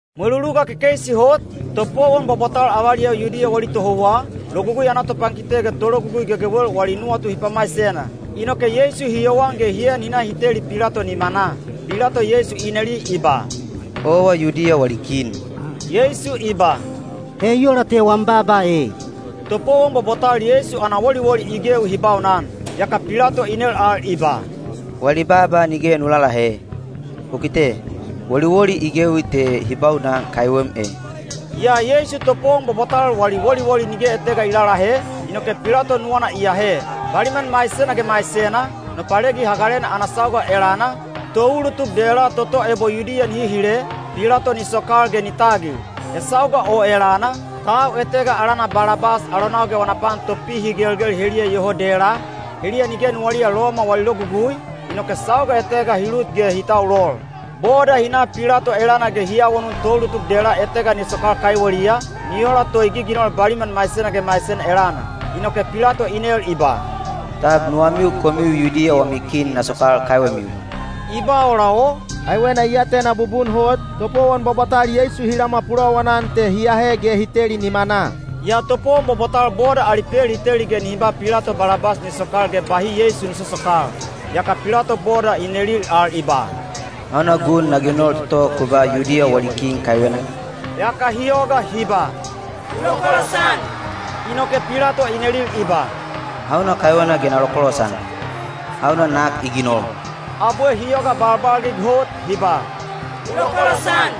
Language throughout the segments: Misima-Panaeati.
Mweluluga kekeisi hot, topowon bwabwatal avaliyau Yudiya wali tohouwa, Logugui ana topankite ge tologugui gegewel wali nuwatu hi pamaisena. Inoke Yeisu hi yowan ge hi en hi na hi teli Pilato nimanaa. Pilato Yeisu i neli i ba, “Owa Yudiya wali kin?” Yeisu i ba, “He i ola te wam baaba ei.” Topowon bwabwatal Yeisu ana woliwoli i gewi hi baunan. Yaka Pilato i nel al i ba, “Wali baaba nige nu lalahe? U kite, woliwoli i gewi te hi baunan kaiwem e!” Yaa Yeisu topowon bwabwatal wali woliwoli nige etega i lalahe, inoke Pilato nuwana i ahe. Baliman maisena ge maisena, Nopalegi Hagalena ana sauga elana, toulutuk dela toto ebo Yudiya nihi hile, Pilato ni sokal ge ni tagil. He sauga o elana, tau etega alana Balabas alonau ge wana pan topihigelgel heliya iyoho dela, heliya nige nuwaliya Loma wali logugui, inoke sauga etega hi lut ge hi taulol. Boda hi na Pilato elana ge hi awanun toulutuk dela etega ni sokal kaiweliya, ni ola to i giginol baliman maisena ge maisena elana. Inoke Pilato i nel i ba, “Tab nuwamiu komiu Yudiya wami kin na sokal kaiwemiu?” I ba ola o, kaiwena i atena bubun hot, topowon bwabwatal Yeisu hi lamwa pulowanan te hi ahe ge hi teli nimanaa. Yaa topowon bwabwatal boda ali pel hi teli ge nihi ba Pilato Balabas ni sokal ge bahi Yeisu ni sosokal. Yaka Pilato boda i nelil al i ba, “Hauna gun na ginol toto ku ba Yudiya wali kin kaiwena?” Yaka hi yoga hi ba, “U lokolosan!” Inoke Pilato i nelil i ba, “Hauna kaiwena ge na lokolosan? Hauna nak i ginol?” Abwe hi yoga balbalgig hot hi ba, “U lokolosan!”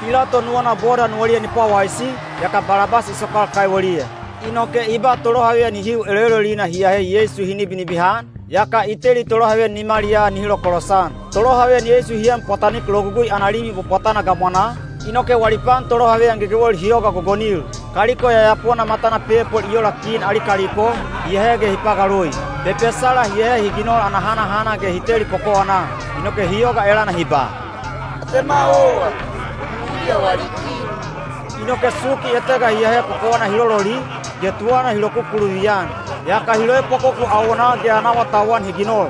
Pilato nuwana boda nuwaliya ni pwawaisi, yaka Balabas i sokal kaiweliya. Inoke i ba tolohaveyan hihiu eloelolina hi ahe Yeisu hi nibinibihan, yaka i teli tolohaveyan nimaliyaa nihi lokolosan. Tolohaveyan Yeisu hi en pwatanik logugui ana limi bwabwatana gamwanaa, inoke wali pan tolohaveyan gegewel hi yoga gogonil. Kaliko yayapona matana pepol i ola kin ali kaliko, hi ahe ge hi pagaloi. Pepesala hi ahe hi ginol ana hanahana ge hi teli kokowanaa. Inoke hi yoga elana hi ba, “Atema owa, Yudiya wali kin.” Inoke suki etega hi ahe kokowana hi lololi, ge tuwana hi lokukuluvi-an. Yaka hi loepwakoku awonaa ge ana awatauwan hi ginol.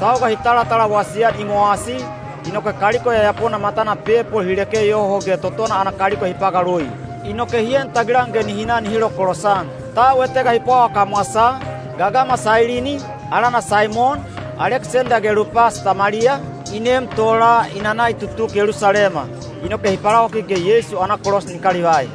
Sauga hi talatalawasi-an i mowasi, inoke kaliko yayapona matana pepol hi leke yoho ge totona ana kaliko hi pagaloi. Inoke hi en tagilan ge nihi na nihi lokolosan. Tau etega hi pwawa kamwasaa, gagama Sailini, alana Saimon, Aleksenda ge Lupas tamaliya, i neem tola i nana i tutuk Yelusalema. Inoke hi palawakik ge Yeisu ana kolos ni kalivai.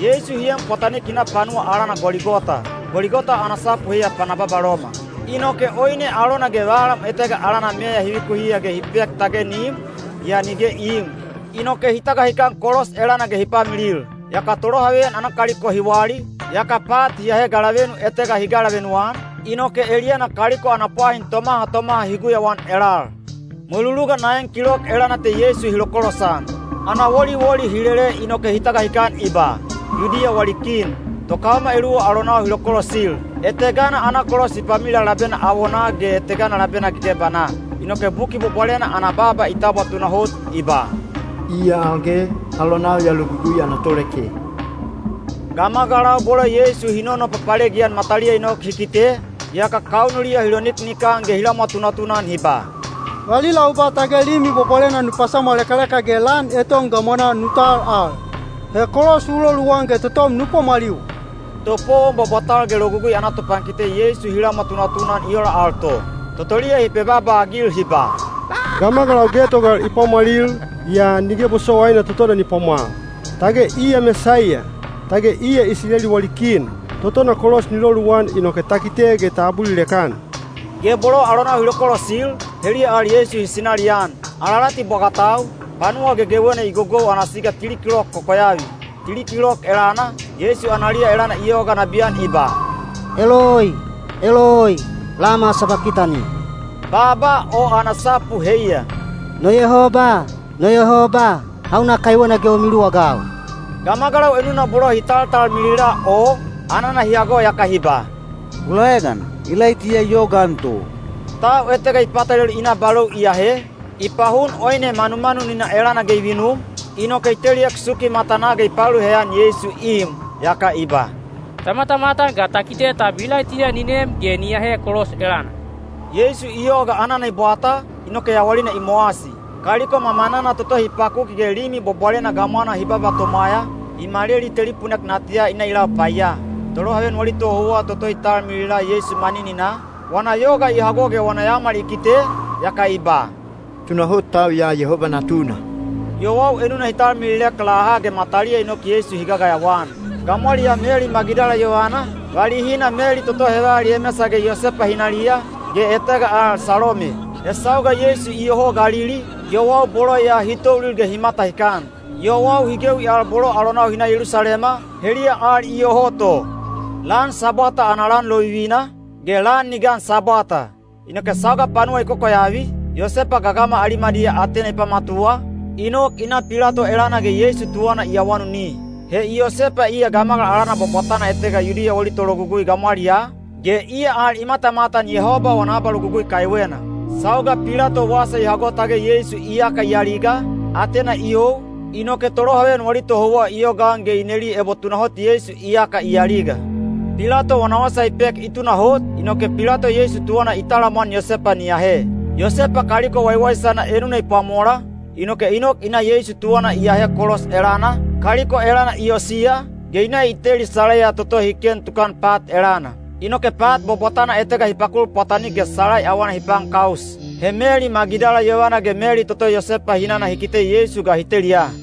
Yeisu hi en pwatanik hi na panuwa alana Goligota. (Goligota ana sapu heiya “Pana Babaloma.”) Inoke oine alona ge valam etega alana meya hi vikuhiya ge hi pek tage ni im, yaa nige i iim. Inoke hi tagahikan kolos elana ge hi pamilil. Yaka tolohaveyan ana kaliko hi wali, yaka pat hi ahe galavenu etega hi galavenu-an, inoke eliyana kaliko ana pwahin tomaha tomaha hi guyauan elal. Mweluluga naen kilok elana te Yeisu hi lokolosan. Ana woliwoli hi lele inoke hi tagahikan i ba, “Yudiya wali kin.” Tokaoma eluwa alonau hi lokolosil. Etegana ana kolos hi pamilila labena awonaa ge etegana labena gegebanaa. Inoke Buki Bwabwalena ana baaba i tabwa tunahot, i ba, “Iya al ge, alonau ya logugui ana toleke.” Gamagalau bolo Yeisu hi nonopapalegi-an mataliya i nok hi kite, yaka kaunuliya hi loniknikan ge hi lamwa tunatuna-an hi ba, “Valila u ba tage Limi Bwabwalena nu pasamwalekaleka ge lan eton gamwanaa nu tal al. He kolos u loluwan ge totom nu pwamwaliwa!” Topowon bwabwatal ge Logugui ana topankite Yeisu hi lamwa tunatuna-an i ola al to. Totoliya hi pebaaba-agil hi ba, “Gamagalau getogal i pwamwalil, yaa nige bosowaina totona ni pwamwal. Tage iya Mesaiya! Tage iya Isileli wali kin! Totona kolos ni loluwan inoke ta kite ge ta abulilek-an.” Ge bolo alonau hi lokolosil, heliya al Yeisu hi sinalian. Alalati bwagatau, panuwa gegewena i gogou ana siga tili kilok kokoyavi. Tili kilok elana, Yeisu analiya elana i yoga nabiyan i ba, “Eloi, eloi, lama sabakitani?” Baaba o ana sapu heiya, “No Yabowaine, no Yabowaine, hauna kaiwena ge u miluwagau?” Gamagalau enuna bolo hi taltalmilila o, anana hi hago yaka hi ba, “Ku laegan, Ilaitiya i yogaan to.” Tau etega i patalelu i na balou i ahe, i pahun oine manumanunina elana ge i vinum, inoke i teliek suki matanaa ge i paelu heyan Yeisu i im. Yaka i ba, “Ta matamatan ga ta kite tab Ilaitiya ni nem ge ni ahe kolos elana.” Yeisu i yoga anana i bwata, inoke yawalina i mowasi. Kaliko mamanana toto hi pakuki ge Limi Bwabwalena gamwana hi baba tomwaya, i maleli telipunek natiya i na i lau paiya. Tolohaveyan wali tohouwa toto i talmilila Yeisu manininaa, wana yoga i hago ge wana yaomal i kite, yaka i ba, “Tunahot tau ya Yehoba Natuna!” Yowau enuna hi talmililek laha ge mataliya i nok Yeisu hi gagayawa-an. Gamwaliyaa Meli Magidala yovana, valihina Meli toto heval Yemesa ge Yosepa hinaliya, ge etega al Salome. He sauga Yeisu iyoho Galili, yowau bolo ya hi toulil ge hi matahikan. Yowau hi gewi al bolo alonau hi na Yelusalema, heliya al iyoho to. Lan Sabwata ana lan lovivina, ge lan ni gan Sabwata. Inoke sauga panuwa i kokoyavi, Yosepa gagama Alimadiya atena i pamatuwa, i nok i na Pilato elana ge Yeisu tuwana i awanuni. He Yosepa iya gamagal alana bwabwatana etega Yudiya wali tologugui gamwaliyaa, ge iya al i matamatan Yehoba wana abalogugui kaiwena. Sauga Pilato wasa i hago tage Yeisu iyaka i aliga, atena i you, inoke tolohaveyan wali tohouwa i yogaan ge i neli ebo tunahot Yeisu iyaka i aliga. Pilato wana wasa i pek i tunahot, inoke Pilato Yeisu tuwana i talamwan Yosepa ni ahe. Yosepa kaliko waiwaisana enuna i pwamola, inoke i nok i na Yeisu tuwana i ahe kolos elana, kaliko elana i osiya, ge i na i teli salaiya toto hi ken tukan pat elana. Inoke pat bwabwatana etega hi pakul pwatanik ge salai awana hi paankaus. He Meli Magidala yovana ge Meli toto Yosepa hinana hi kite Yeisu ga hi teliya.